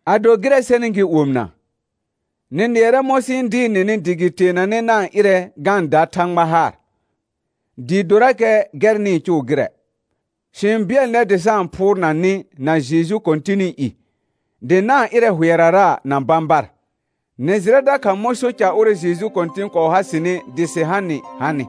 Ado gɩrɛ sɛnɩ gɩ omɩna, nɩ nɩɛrɛ mɔ̃ sɩ-n dɩɩr nɩnɩ dɩ gɩ teenanɛ na-n ɩrɛ ga-n da Thãgba haar, dɩɩ dorakɛ gɛr nɩ-n cʋʋ gɩrɛ, sɩ-n bɩɛl nɛr dɩ sa-n phʋʋrna nɩ na Jeju Kɔ̃tɩnɩ i, dɩ na-n ɩrɛ hʋɛrara na bãbar. Nɩ jɩrɛ dakha mɔ̃ so ca ʋrɛ Jeju Kɔ̃tɩn kɔɔ ha sɩnɩ dɩ sɩ ha nɩ hanɩ.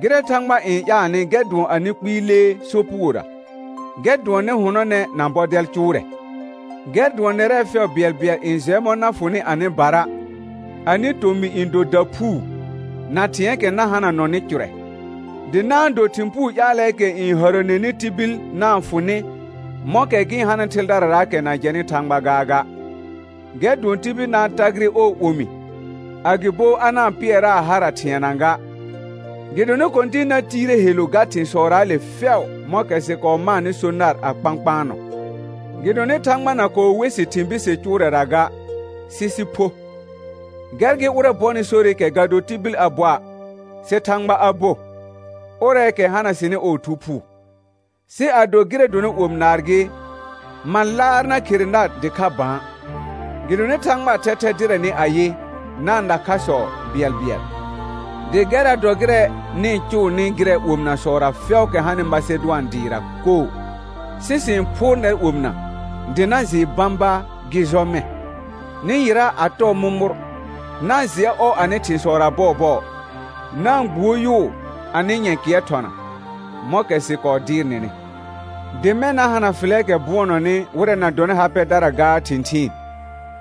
Gɩrɛ Thãgba n ƴaalnɩ gɛr dʋɔn anɩ kpɩɩ lee sopugora; gɛr dʋɔn nɩ hʋnɔnɛ na bɔdɛl cʋʋrɛ; gɛr dʋɔn nɛrɛ fɛʋ bɩɛlbɩɛl n jɛ mɔ̃ na fʋnɩ anɩbara, anɩ tomɩ n do daphuu, na thɩ̃ɛɛkɛ na hananɔnɩ cʋrɛ. Dɩ na-n do thɩ̃ puu ƴaalɛɛkɛ n hərəneni tibil na-n fʋ nɩ, mɔ̃kɛ gɩ-n hanɩ thɩldararaakɛ na jɛnɩ Thãgba gaaga; gɛr dʋɔn tibil na-n tagɩrɩ ɔɔ omi, agɩbo a na-n pɩɛraa hara thɩɛna ga, gɩdonɩ Kɔ̃tɩn na tiire helu ga thɩ̃sɔraale fɛʋ mɔ̃kɛ sɩ kɔɔ maanɩ so nar a kpãkpaanɔ. Gɩdonɩ Thãgba na kɔɔ we sɩ thɩ̃ bise cʋʋrɛra ga, sɩ sɩ pho. Gɛr gɩ ʋrɛ bɔnɩ sorɩkɛ ga do tibil a boa', sɩ Thãgba a bo, ʋrɛɛkɛ hana sɩnɩ ɔɔ Thu Phuu. Sɩ ado gɩrɛ dɔnɩ omi naar gɩ, ma laar na khere nar dɩkha bã, gɩdonɩ Thãgbaa thɛthɛ dɩrɛ nɩ ayɩ, na-n na khasɔ bɩɛlbɩɛl. Dɩ gɛrra dɔrakɛ gɩrɛ nɩ-n cʋʋnɩ gɩrɛ omɩnasɔra fɛʋʋkɛ hanɩ Masedʋan dɩɩra koo, sɩ sɩ-n phʋʋr nɛr omɩna, dɩ na jɩɩ bãba gɩ jɔ mɛ̃. Nɩ yɩra a tɔɔ mʋmʋr, na-n jɩɛ ɔ anɩ thɩ̃sɔra bɔɔbɔɔ, na-n gbuo yʋʋ anɩ nyɛ̃kɩɛr thɔna, mɔ̃kɛ sɩ kɔɔ dɩɩr nɩnɩ. Dɩ mɛ̃ na hana fɩlɛɛkɛ bʋɔnɔnɩ wɩrɛ na dɔnɩ ha pɛdara gaa thɩ̃thɩɩn,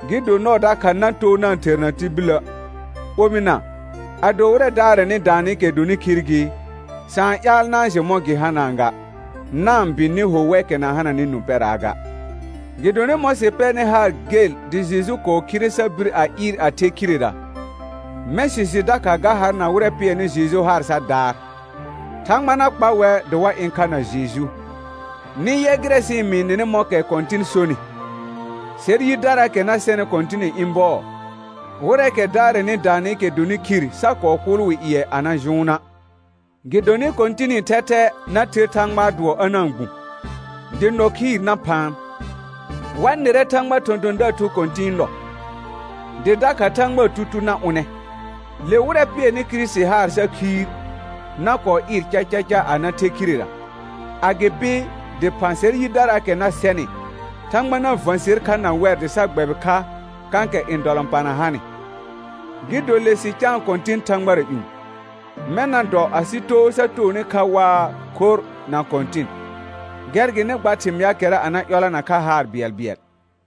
gɩ do nɔɔ dakha na too na-n therna tibilə'. Omɩna, ado wɩrɛ daarɛnɩ daanɩkɛ dɔnɩ khir gɩ, sa-n ƴaal na-n jɩ mɔ̃ gɩ hanaa ga, na-n bɩ nɩ ho wɛkɛ na hananɩ nũ pɛraa ga. Gɩdonɩ mɔ̃ sɩ pɛrnɩ haar gel dɩ Jeju kɔɔ khire sa bir a ɩɩr a the khirera, mɛ̃ sɩ jɩ dakha ga har na wɩrɛ pɩɛrnɩ Jeju haar sa daar, Thãgba na kpa wɛr dɩ wa ɩ̃ kha na Jeju. Nɩ yɛ gɩrɛ sɩ-n mɩɩ nɩnɩ mɔ̃kɛ Kɔ̃tɩn sonɩ, sɛr yidaraakɛ na sɛnɩ Kɔ̃tɩnɩ ɩ̃ bɔɔ, wɩrɛɛkɛ daarɛnɩ daanɩkɛ dɔnɩ khir sa kɔɔ kʋʋl wɩ ƴɩɛ a na jʋʋna'. Gɩdonɩ Kɔ̃tɩnɩ thɛthɛ na ther Thãgbaa dʋɔ a na-n gbũ, dɩ nɔ khɩɩr na phaan, wa nɩrɛ Thãgbaa thɔ̃thɔ̃daar thu kɔ̃tɩ̃ɩ nɔ, dɩ dakha Thãgbaa tutuu na ʋnɛ, le wɩrɛ pɩɛrnɩ Kirisiti haar sa khiir na kɔɔ ɩɩr cacaca a na the khirera. Agɩpɩ dɩphã sɛr yidaraakɛ na sɛnɩ, Thãgba na və̃ ser kha na wɛr dɩ sa gbɛbɩ kha kãkɛ ndɔlɔ̃pana hanɩ, gɩ do le sɩ caan Kɔ̃tɩn thãgbara ƴũ. Mɛ̃ na dɔ asɩ too sa toonɩ kha waa khorr na Kɔ̃tɩn. Gɛr gɩ nɩ gba thɩmɩaakɛra a na ƴɔlana kha haar bɩɛlbɩɛl.